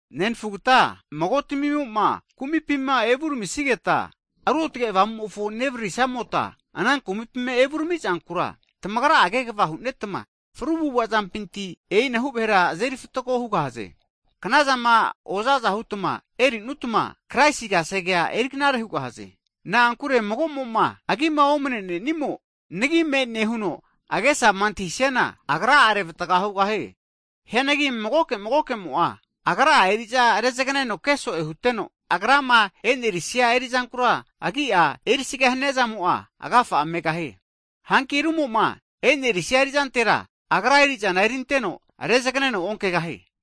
Nenafugta magotamimo'ma kumipima evuramisigeta, Ruotge Avamumofo nevaririsamota, ana kumapima evuramizankura tamagra'a kegva hu'netma, fru avu'avazampinti e'inahu vahera azeri fatgo hugahaze. Knazama oza aza hutma erinutma, Kraisi kasegea eri knare hugahaze. Na'ankure mago'mo'ma agima omnenenimo, nagi me'ne huno agesama antahisiana, agra'a revatga hugahie. Hianagi magoke magokemo'a agra'a eri'za rezagneno keso'e huteno, agrama e'nerisia erizankura agi'a erisaga haniazamo'a agafa'a megahie. Hanki rumoma enerisia erizantera, agra eri'zana erinteno rezagneno onkegahie.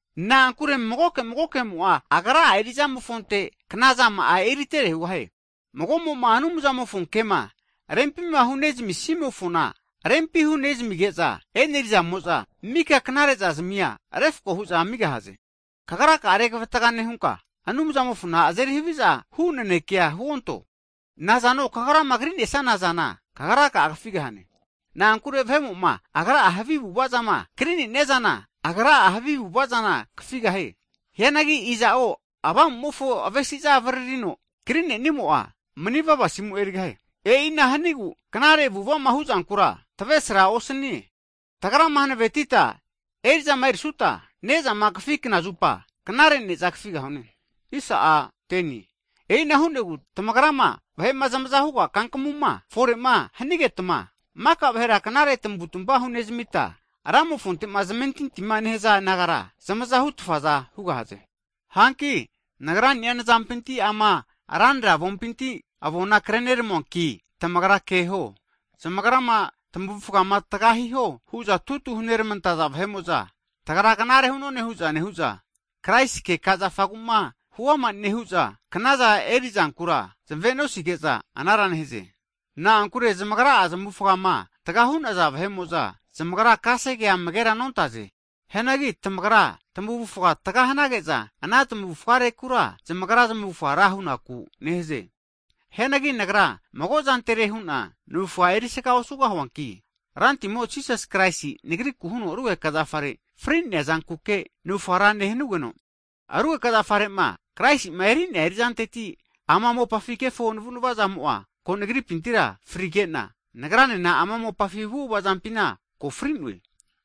Na'ankure magoke magokemo'a agra'a eri'zamofonte knazama'a eritere hugahie. Mago'mo'ma Anumzamofo kema rempima hunezamisimofona, rempima hunezamige'za e'nerizamo'za, mika knare'zazamia refko hu'za amigahaze. Kagraka'a regavatga nehunka, Anumzamofona azeri haviza hu naneke huonto, nazano kagrama kri'nesana zana, kagraka'a kafigahane. Na'ankure vahe'mo'ma agra'a havi avu'avazama kri'nenia zana, agra'a havi avu'avazana kafigahie. Hianagi iza'o Avamumofo avesiza avaririno kri'nenimo'a, Manivava asimu erigahie. E'ina hanigu knare avu'avama hu'zankura tavesra osanie. Tagrama hanavetita erizama erisuta, nezama kafi knazupa knare ne'za kafigahune. E'ina hu'negu tagrama vahe'ma zmaza huga kankamuma fore'ma hanigetma, maka vahera knare tavutva hunezamita, Ramofonte'ma zamentintima nehaza nagara zamazahutfaza hugahaze. Hanki nagrani'a nazampinti ama ranra avontamimpinti avoma krerami'noanki, tamagra keho. Zamagrama tamavufgama tga hiho hu'za tutu hunermantaza vahe'mo'za, tagra knare hu'none hu'za nehu'za, Kraisi keka zafagu'ma huama nehu'za, knazama eri'zankura zmave'nosige'za anara nehaze. Na'ankure zamagra'a zmavufama tga hu'naza vahe'mo'za, zamagra kasegea amagera nontaze. Hianagi tamagra tamavufa tga hanage'za, ana tmavufgarekura zamagra zmavufga ra hu'naku neheze. Hianagi nagra mago'zantere hu'na navufga erisaga osugahuanki, Rantimo Jisasi Kraisi nagriku huno rugeka zafare fri'nea zankuke navufga ra nehanugeno, Rugeka zafare'ma Kraisima eri'nea eri'zanteti ama mopafi kefo navu'nava'zamo'a ko nagripintira frigena, nagranena ama mopafi avu'ava zampina ko fri'noe.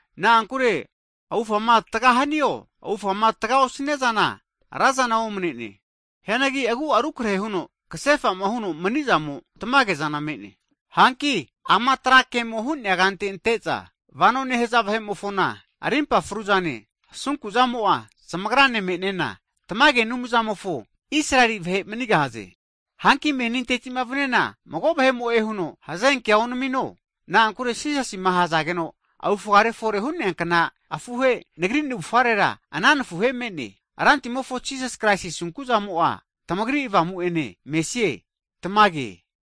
Na'ankure avufama tga hanio, avufama tga osniana razana omnene, hianagi agu'a rukrehe huno kasefa'ma huno mani'zamo tamagezana me'ne. Hanki ama trakemo ke hu'nea kante ante'za vano nehaza vahe'mofona, rimpa fru'zane, asunku'zamo'a zamagrane me'nena, tamage Anumzamofo Israeli vahe manigahaze. Hanki menintetima vaniana, mago vahe'mo'e huno hazenkea onamino, na'ankure Jisasima ahazageno avufgare fore hu'neankna afuhe, nagri navufarera ana nafuhe me'ne. Rantimofo Jisasi Kraisi asunku'zamo'a tamagri avamu'ene mesie. Tamage.